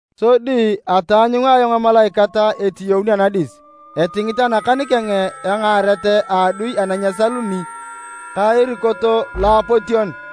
Sodi ataanyunga ayong emalaikat etiyaun anadis, etingit anakan keng engaaret a adui ana nyesaluni ka erikot loapotion.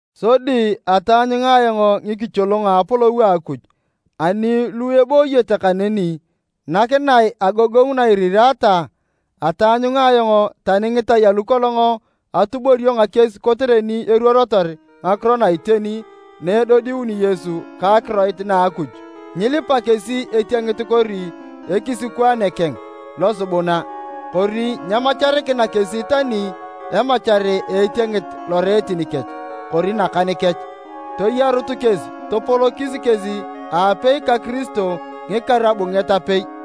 Sodi ataanyunga ayong ngikicholongo a apolou a Akuj, ani lu ebooyete kaneni, nakinae agogongu na iriraata. Ataanyunga ayong tani ngitai alu kolong atuborio ngakies kotere ni iruorotor ngakiro na iteni na edodiuni Yesu ka akiroit na a Akuj. Nyilipa kesi etiengit kori ekisikwaane keng losubuna, kori nyemacharikina kesi tani emachar a etiengit loreetin kech kori nakan kech. Toyarut kesi topolokis kesi aapei ka Kiristo ngikaru abunget apei.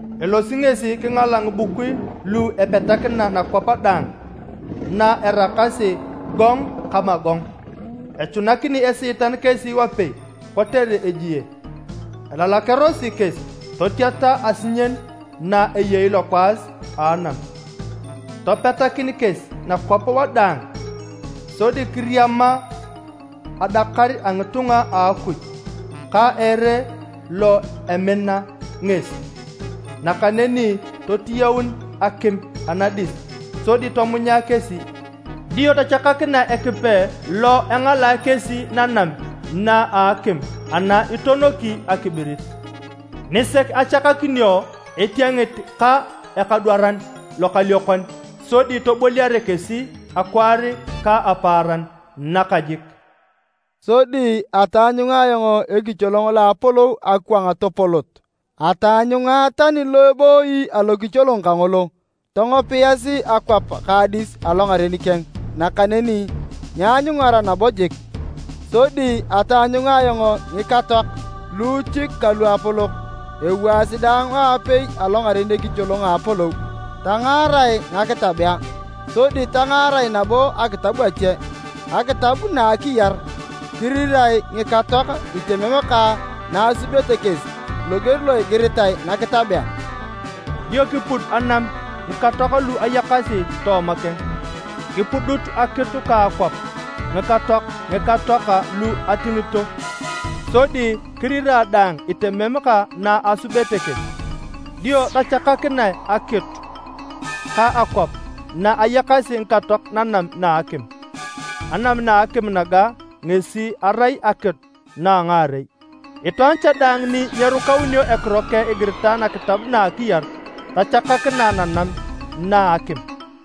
elosi ngesi kingala ngibukui lu epetakina nakwap daang, na eraakasi Gog ka Magog. Echunakini Esiitan kesi wapei kotere ejie, elalakearosi kesi totiata asinyen na eyei lokwaas a anam. Topetakin kesi nakwap wadaang sodi kiriama adakar a ngitunga a Akuj ka ere lo emina ngesi. Nakaneni totiyaun akim anadis sodi tomunya kesi. Dio tachakakinae Ekipe lo engalae kesi nanam na a akim ana itonoki akibirit, nisek achakakinio etiengit ka ekadwaran lokaliokon, sodi toboliare kesi akwaar ka apaaran, nakajik. Sodi ataanyunga ayong ekicholong lo apolou akwang topolot, ataanyunga tani lo ebooyi alokicholong kangolo. Tongopiasi akwap ka adis alongaren keng nakaneni nyeanyungara nabo jik. Sodi ataanyunga ayong ngikatoak, luuchik ka luapolok ewaasi daang aapei alongaren ekicholong a apolou. Tangaarae ngakitabea, sodi tangaarae nabo akitab ache, akitab na a akiyar. Kirirae ngikatoak itemem ka na asubete kesi, loger lo igiritere nakitabea. Dio kipud anam ngikatoak lu ayakasi tooma keng. Kipudut akitu ka akwap a ngikatoak ngikatoak lu atingito. Sodi kirirae daang itemem ka na asubete kesi. Dio tachakakinae akitu ka akwap na eyakasi ngikatoak nanam na a akim. (Anam na akim naga ngesi erai akitu na a ngaarei). Itwaan cha daang ni nyerukaunio ekiro keng igiritae nakitab na a akiyar, tachakakinae nanam na a akim.